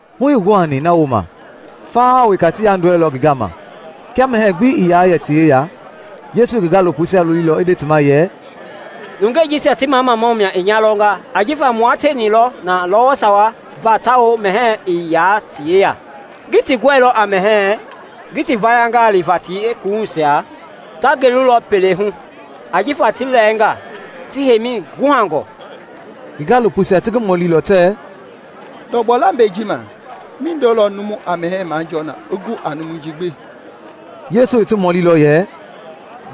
Hu ii guhani na wooma, faha wa weka ti yandɔɛilɔ ngi gama. Kia mɛhɛɛ gbi ii yaa yɛ ti yeya, Yesu i ngi gaalopoisia lolilɔ i nde ti ma yɛ, “Nungei jisia ti mamamau i nya lɔnga ajifa mua tieni lɔ na lɔwɔ sawa va tawao mɛhɛɛ ii yaa ti yeya. Ngii ti gɔilɔ a mɛhɛɛ ngi ti vayangaa liva ti yeekuwuhuisia ta gelulɔ pelei hu ajifa ti lɛɛnga ti hiyemɛi guhangɔ.” Ngi gaalopoisia ti ngi mɔlilɔ tɛɛ, “Ndɔgbɔ lambɛi ji ma mindo lɔ numu a mɛhɛɛ jɔɔ na i gu a numui ji gbi?” Yesu i ti mɔlilɔ yɛ,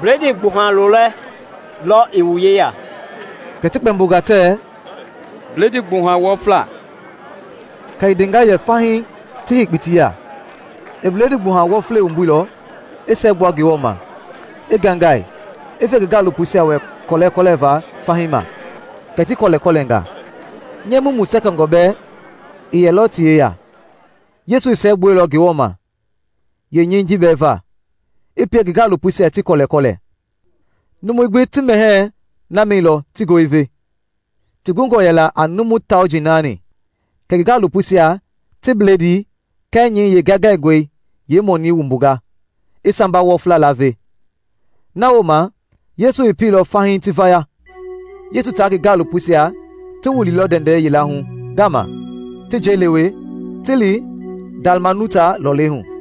“Bledii gbuha lolɛ lɔ i wu yeya?” Kɛ ti kpɛmbonga tɛɛ, “Bledii gbuha wɔfla.” Kɛ i ndenga yɛ fahii ti hei kpitii ya. I bledii gbuha wɔflei wumbuilɔ, i siɛgbua Ngewɔ ma, i ngaingai, i fe ngi gaalopoisia wɛ kɔlɛkɔlɛva fahii ma, kɛ ti kɔlɛkɔlɛnga. Nyɛɛ mumu sɛkɛngɔ bɛɛ i yɛlɔ ti yeya. Yesu i siɛgbuɛilɔ Ngewɔ ma yeenyɛi ji bɛɛ va, i pie ngi gaalopoisia ti kɔlɛkɔlɛ. Numui gbi ti mɛhɛɛi na mɛilɔ ti goo i ve. Ti gungɔ yɛla a numu tauji nani. Kɛ ngi gaalopoisia ti bledii kɛɛ nyɛi yeengaingaingɔi yeemɔnii wumbunga, i samba wɔfla laave. Na wooma Yesu i pieilɔ fahii ti vaya. Yesu taa ngi gaalopoisia ti wililɔ ndɛndɛ yila hu ngama, ti njɛi lewe ti li Dalmanuta lɔlei hu.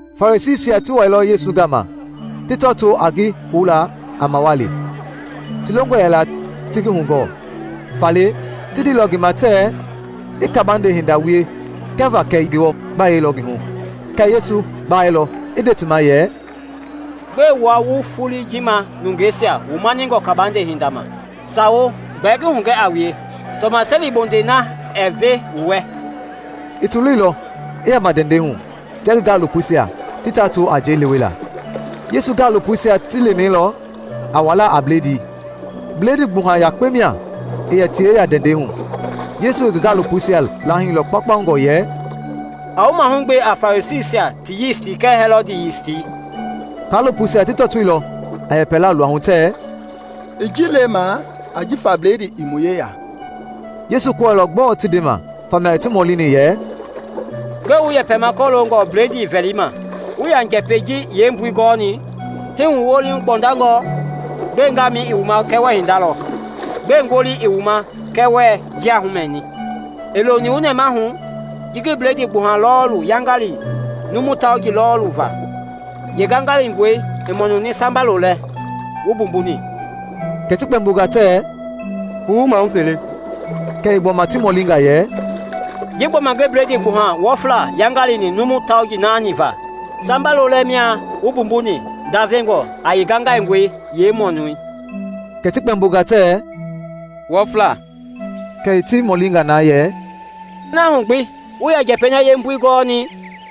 Farisiisia ti wailɔ Yesu gama ti tɔtoo a ngi houla a mawali. Ti longɔ yɛla ti ngi hugɔɔ, faale ti ndeilɔ ngi ma tɛɛ i kabande hinda wie kɛva kɛ Ngewɔ gbayei lɔ ngi hu. Kɛɛ Yesu gbailɔ, i nde ti ma yɛ, “Gbɛe wua wu foloi ji ma nungeisia wa mani kabande hinda ma? Sawo, gbɛɛ ngi hugɛ a wue, tɔmaseli bondei na ɛɛ ve wu wɛ!” I ti loilɔ, i yama ndɛndɛi hu, tia ngi gaalopoisia ti tɔtoo a njɛi lewela. Yesu gaalopoisia ti lemailɔ a wala a bledii; bledii gbuha yakpe mia i yɛ ti yeya ndɛndɛi hu. Yesu i ngi gaalopoisia laahilɔ kpaukpaungɔ yɛ, “A wu mahugbe a Farisiisia ti yisti kɛɛ Hɛlɔd yisti.” Kaalopoisia ti tɔtoilɔ a yɛpɛla luahu tɛɛ, “I ji lemaa ajifa bledii ii mu yeya.” Yesu kɔɛilɔ gbɔɔ ti ndema, famia i ti mɔlini yɛ, “Gbɛe wu yɛpɛma kɔloongɔ bledii vɛli ma? Wuii ya njɛpɛi ji yeembui gɔni? Hii wu woohu gbɔndangɔ? Gbɛe ngaamɛi i wu ma kɛɛ wuɛɛ hinda lɔ? Gbɛe ngolii i wu ma kɛɛ wuɛɛ njia mɛni? Ii loni wu nɛmahu, ji ngi bledii gbuha lɔɔli yaingaini numu tauji lɔɔlii va? Yee ngaingaingɔi i mɔnuni samba lolɛ wu mbumbuni?” Kɛ ti kpɛmbonga tɛɛ, “Puu mahu fele.” Kɛ i gbɔma ti mɔlinga yɛ, “Ji gbɔma ngi bledii gbuha wɔflei yaingaini numu tauji nani va, samba lolɛ mia wu mbumbuni ndavengɔ a yeengaingaingɔi yeemɔnii?” Kɛ ti kpɛmbonga tɛɛ, “Wɔfla.” Kɛ i ti mɔlinga na yɛ, “Na hu gbi, wuii yaa njɛpɛi na yeembui gɔni?”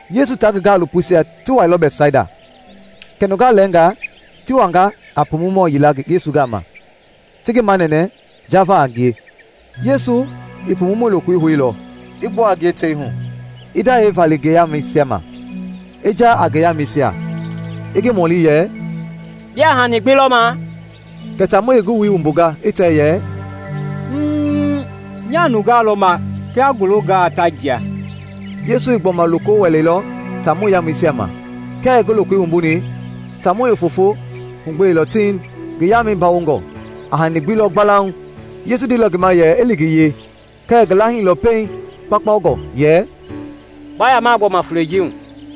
Yesu taa ngi gaalopoisia ti wailɔ Bɛtsaida, kɛ nungaa lɛɛngaa ti wanga a pumumɔ yila Yesu gama ti ngi manɛnɛ jaava a ngie. Yesu i pumumɔi lokoi houilɔ, i gbua a ngie tei hu, i ndayɛi vali ngi yamɛisia ma, i jaa a yeengamɛisia, i ngi mɔli yɛ, “Biaa hani gbi lɔma?” Kɛ taamɔi i ngi wui wumbua i tɛ yɛ, “Mmm, nyaa nungaa lɔma kia ngulungaa, ta jia.” Yesu i gbɔma loko wɛleilɔ taamɔi yamɛisia ma. Kia i ngi lokoi wumbuni, taamɔi i fofoi hugbeilɔ tiŋ, ngi yamɛi bawongɔ, a hani gbi lɔ gbalauŋ. Yesu i ndeilɔ ngi ma yɛ i li ngi yee kɛɛ i ngi lahiilɔ pɛiŋ kpaukpaungɔ yɛ, “Ba yama gbɔma fulei ji hu.”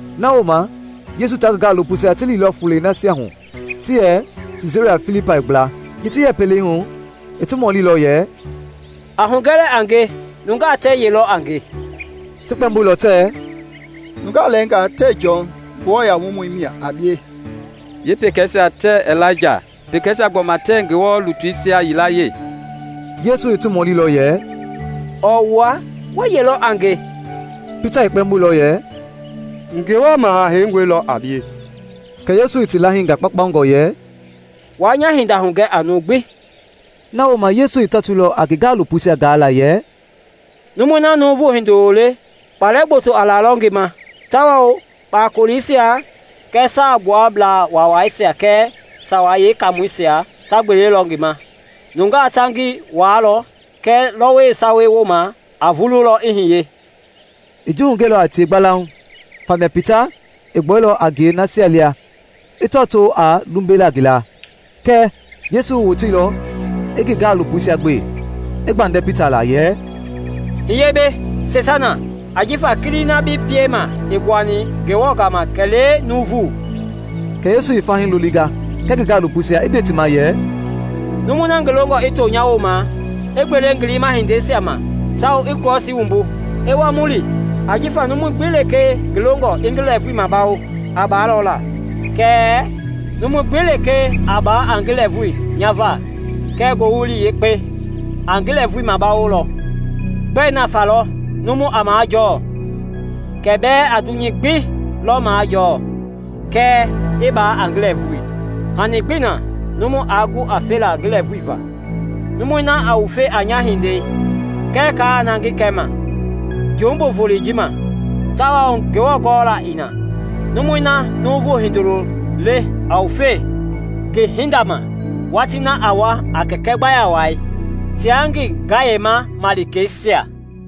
Na wooma Yesu taa ngi gaalopoisia ti liilɔ fulei nasia hu ti yɛ Siisaria Filipai gbla. Ji ti yɛ pelei hu, i ti mɔlilɔ yɛ, “A hugɛ lɛɛ a nge, nungaa tɛɛ ye lɔ a nge?” Ti kpɛmboilɔ tɛɛ, “Nungaa lɛɛngaa tɛɛ Jɔn, Nguamɔi, mia a bie, yeepekeisia tɛɛ Ilaija, pekeisia gbɔma tɛɛ Ngewɔ lutuisia yilayee.” Yesu i ti mɔlilɔ yɛ, “Ɔɔ wua, wɛɛ ye lɔ a nge?” Pita i kpɛmboilɔ yɛ, “Ngewɔ Maha Heingɔi lɔ a bie.” Kɛ Yesu i ti lahinga kpaukpaungɔ yɛ, “Waa nya hinda hugɛ a numu gbi.” Na wooma Yesu i tɔtoilɔ a ngi gaalopoisia gaala yɛ, “Numui na Nuuvu Hindoloi le, kpalɛ gboto a lalɔ ngi ma tawao kpakoleisia kɛɛ Saagbuablaa Waawaisia kɛɛ Sawei Yeekaamɔisia ta gbelelɔ ngi ma. Nungaa ta ngi waalɔ kɛɛ lɔwɔ sawa wooma a vululɔ i hiye.” I ji hugɛilɔ a tie gbalauŋ. Famia Pita i gbuailɔ a ngie nasia lia i tɔtoo a lumbela ngi la. Kɛɛ Yesu i woteilɔ i ngi gaalopoisia gbe, i gbandɛ Pita la yɛ “Hiye mbɛ! Seitana. Ajifa kilii na bi piema ii gbuani Ngewɔ gama kɛlee nuuvu!” Kɛ Yesu i fahii lolinga kɛɛ ngi gaalopoisia i nde ti ma yɛ, “Numui na ngi longɔ i to nya wooma, i gbele ngi liima hindeisia ma, tawao i Krɔsii wumbu, i wa mu li. Ajifa numui gbi lekee ngi longɔ i ngi lɛɛvui mabawo, a baalɔ la, kɛɛ numui gbi lekee a baa a ngi lɛɛvui nya va kɛɛ Ngowili Yekpei, a ngi lɛɛvui mabawolɔ. Gbɛ nafa lɔ numu a majɔɔ kia bɛɛ a dunyei gbi lɔ majɔɔ kɛɛ i ba a ngi lɛɛvui? Hani gbii na yeenumui aa gu a felaa ngi lɛɛvui va. Numui na a wufe a nya hindei kɛɛ kaa na ngi kɛma, jumbu volei ji ma tawao Ngewɔ gɔla ii na, numui na Nuuvu Hindoloi le a wufelɔ ngi hinda ma watii na a wa a Kɛkɛi gbaya wai tia ngi gayema malikeisia.”